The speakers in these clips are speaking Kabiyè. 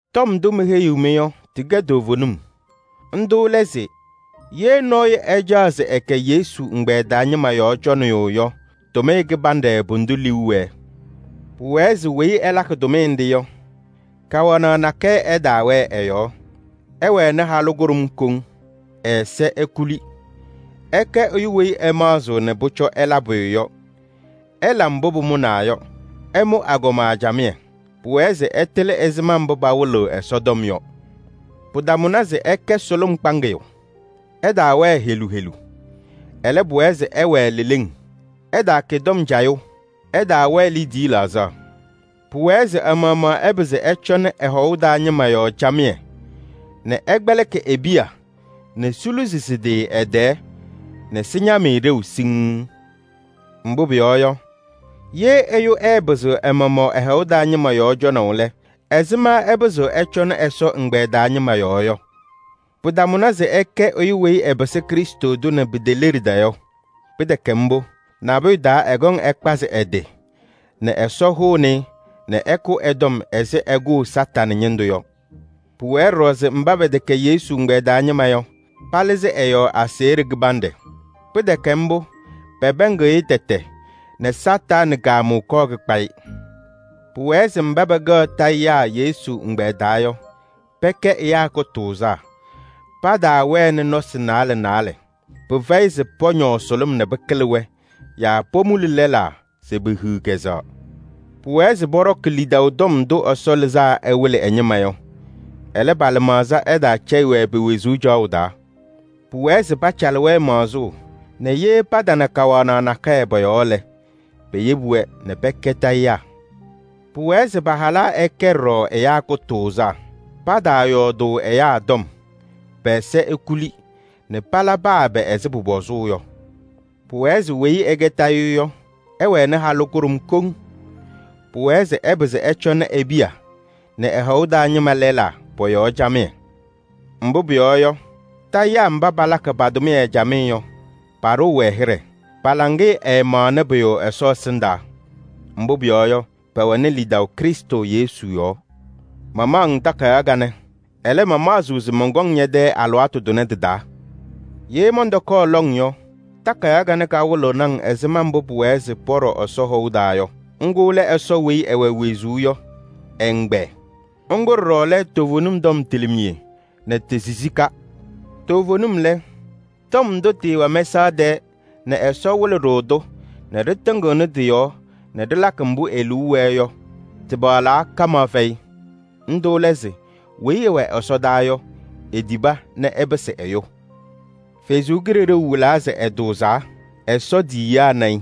Tɔm ndʋ meheyiɣ-mɩ yɔ, tɩkɛ toovenim. Ndʋ lɛ se: ye nɔɔyʋ ɛcaɣ se ɛkɛ Yesu ɛgbɛyɛ taa ñɩma yɔɔ cɔnɩyʋ yɔ, tʋmɩyɛ kɩbanɖɛ pʋdʋ liu wɛɛ. Pʋwɛɛ se weyi ɛlakɩ tʋmɩyɛ nɖɩ yɔ, kawanaɣ nakɛyɛ ɛtaawɛɛ ɛ-yɔɔ. Ɛwɛnɩ halʋ kʋɖʋm koŋ, ɛ-ɛza ekuli. Ɛkɛ ɛyʋ weyi ɛmaɣzɩɣ nɛ pʋcɔ ɛla pʋyʋ yɔ, ɛla mbʋ pʋmʋnaa yɔ, ɛmʋ agɔma camɩyɛ. Pʋwɛɛ se ɛtɩlɩ ɛzɩma mbʋ pawɩlɩɣ Ɛsɔtɔm yɔ. Pɩtamʋnɩ se ɛkɛ sʋlʋm kpaŋɩyʋ, ɛtaawɛɛ helu helu. Ɛlɛ, pʋwɛɛ se ɛwɛɛ leleŋ, ɛtaakɛ tɔm cayʋ, ɛtaawɛɛ liidiye laɣzaɣ. Pʋwɛɛ se ɛ-maɣmaɣ ɛpɩzɩ ɛcɔnɩ ɛ-hɔʋ taa ñɩma yɔɔ camɩyɛ nɛ ɛkpɛlɩkɩ e-piya nɛ siluzi sɩ-tɩ ɛ-tɛɛ nɛ sɩñam-ɩ ɖeu siŋŋ. Mbʋ pʋyɔɔ yɔ, ye ɛyʋ ɛɛpɩzɩɣ ɛ-maɣmaɣ ɛ-hɔʋ taa ñɩma yɔɔ cɔnaʋ lɛ, ɛzɩma ɛpɩzɩɣ ɛcɔnɩ Ɛsɔ ɛgbɛyɛ taa ñɩma yɔɔ yɔ? Pɩtamʋnɩ se ɛkɛ ɛyʋ weyi ɛpɩsɩ Krɩstʋ tʋ nɛ piteleɖida yɔ. Pɩtɛkɛ mbʋ, nabʋyʋ taa ɛkɔŋ ɛkpazɩ ɛ-tɩ nɛ Ɛsɔ hʋnɩ-ɩ nɛ ɛkʋ ɛ-tɔm ɛzɩ ɛkʋʋ Satanɩ ñɩndʋ yɔ. Pʋwɛɛ ɖɔɖɔ se mba pɛtɛkɛ Yesu ɛgbɛyɛ taa ñɩma yɔ, palɩzɩ ɛ-yɔɔ aseɣɖe kɩbanɖɛ. Pɩtɛkɛ mbʋ, pɛpɛɛŋɩɣ-ɩ tɛtɛ nɛ Satanɩ kaamʋʋ kɔɔ kɩnanɩ-ɩ kpaʋ. Pʋwɛɛ se mba pɛkɛɣ tayɩyaa Yesu ɛgbɛyɛ taa yɔ, pɛkɛ ɛyaa kʋtʋʋzaa, pataawɛnɩ nɔsɩ naalɛ naalɛ. Pɩfɛyɩ se pɔñɔɔ sʋlʋm nɛ pɩkɩlɩ-wɛ yaa pomuli lɛlaa se pehiɣ kɛzɛɣ. Pʋwɛɛ se pɔɖɔkɩ lidaʋ tɔm ndʋ Ɛsɔ lɩzaa ɛwɩlɩ ɛ-ñɩma yɔ. Ɛlɛ, pa-lɩmaɣza ɛtaacɛyɩ-wɛ pe-wezuu caɣʋ taa. Pʋwɛɛ se pacalɩ-wɛ maɣzʋʋ nɛ ye patana kawanaɣ nakɛyɛ pɔ-yɔɔ lɛ, peyebi-wɛ nɛ pɛkɛ tayɩyaa. Pʋwɛɛ se pa-halaa ɛkɛ ɖɔɖɔ ɛyaa kʋtʋʋzaa. Pataayɔɔdʋʋ ɛyaa tɔm, pɛ-ɛza ekuli nɛ pala paa ɛbɛ ɛzɩ pʋpɔzʋʋ yɔ. Pʋwɛɛ se weyi ɛkɛ tayɩyʋ yɔ, ɛwɛnɩ halʋ kʋɖʋm koŋ. Pʋwɛɛ se ɛpɩzɩ ɛcɔnɩ e-piya nɛ ɛ-hɔʋ taa ñɩma lɛlaa pɔ-yɔɔ camɩyɛ. Mbʋ pʋyɔɔ yɔ, tayɩyaa mba palakɩ pa-tʋmɩyɛ camɩyɛ yɔ, paɖʋʋ-wɛ hɩɖɛ, pa-laŋɩyɛ ɛɛmaɣnɩ pʋyʋ Ɛsɔ ɛsɩndaa. Mbʋ pʋyɔɔ yɔ, pɛwɛnɩ lidaʋ Krɩstʋ Yesu yɔɔ. Mamaɣ-ŋ takayaɣ kanɛ, ɛlɛ, mamaɣzɩɣ se mɔnkɔŋ ñɛ-tɛ alɩwaatʋ tʋnɛ tɩ-taa. Ye mɔntɔkɔɔ lɔŋ yɔ, takayaɣ kanɛ kawɩlɩɣnɩ-ŋ ɛzɩma mbʋ pʋwɛɛ se pɔɖɔ Ɛsɔ hɔʋ taa yɔ. Ŋgʋ lɛ Ɛsɔ weyi ɛwɛ wezuu yɔ ɛ-ɛgbɛyɛ. Ŋgʋ ɖɔɖɔ lɛ toovenim tɔm tilimiye nɛ ti-sisika. Toovenim lɛ, tɔm ndʋ tɩɩwɛ mɛsaɣ tɛɛ nɛ Ɛsɔ wɩlɩ-ɖʋ-tʋ nɛ ɖɩtɩŋɩɣnɩ tɩ-yɔɔ nɛ ɖɩlakɩ mbʋ e-liu wɛɛ yɔ, tɩpaɣlaa kamaɣ fɛyɩ! Ndʋ lɛ se: weyi ɛwɛ ɛsɔdaa yɔ, etiba nɛ ɛpɩsɩ ɛyʋ. Ɛsɔ Kalɩzaɣ wɩlaa se ɛtʋʋzaa, Ɛsɔ tiyiyaa na-ɩ.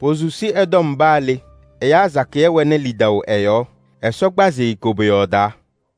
Posusi ɛ-tɔm paa le, ɛyaa sakɩyɛ wɛnɩ lidaʋ ɛ-yɔɔ, Ɛsɔ kpazɩ-ɩ koboyaɣ taa.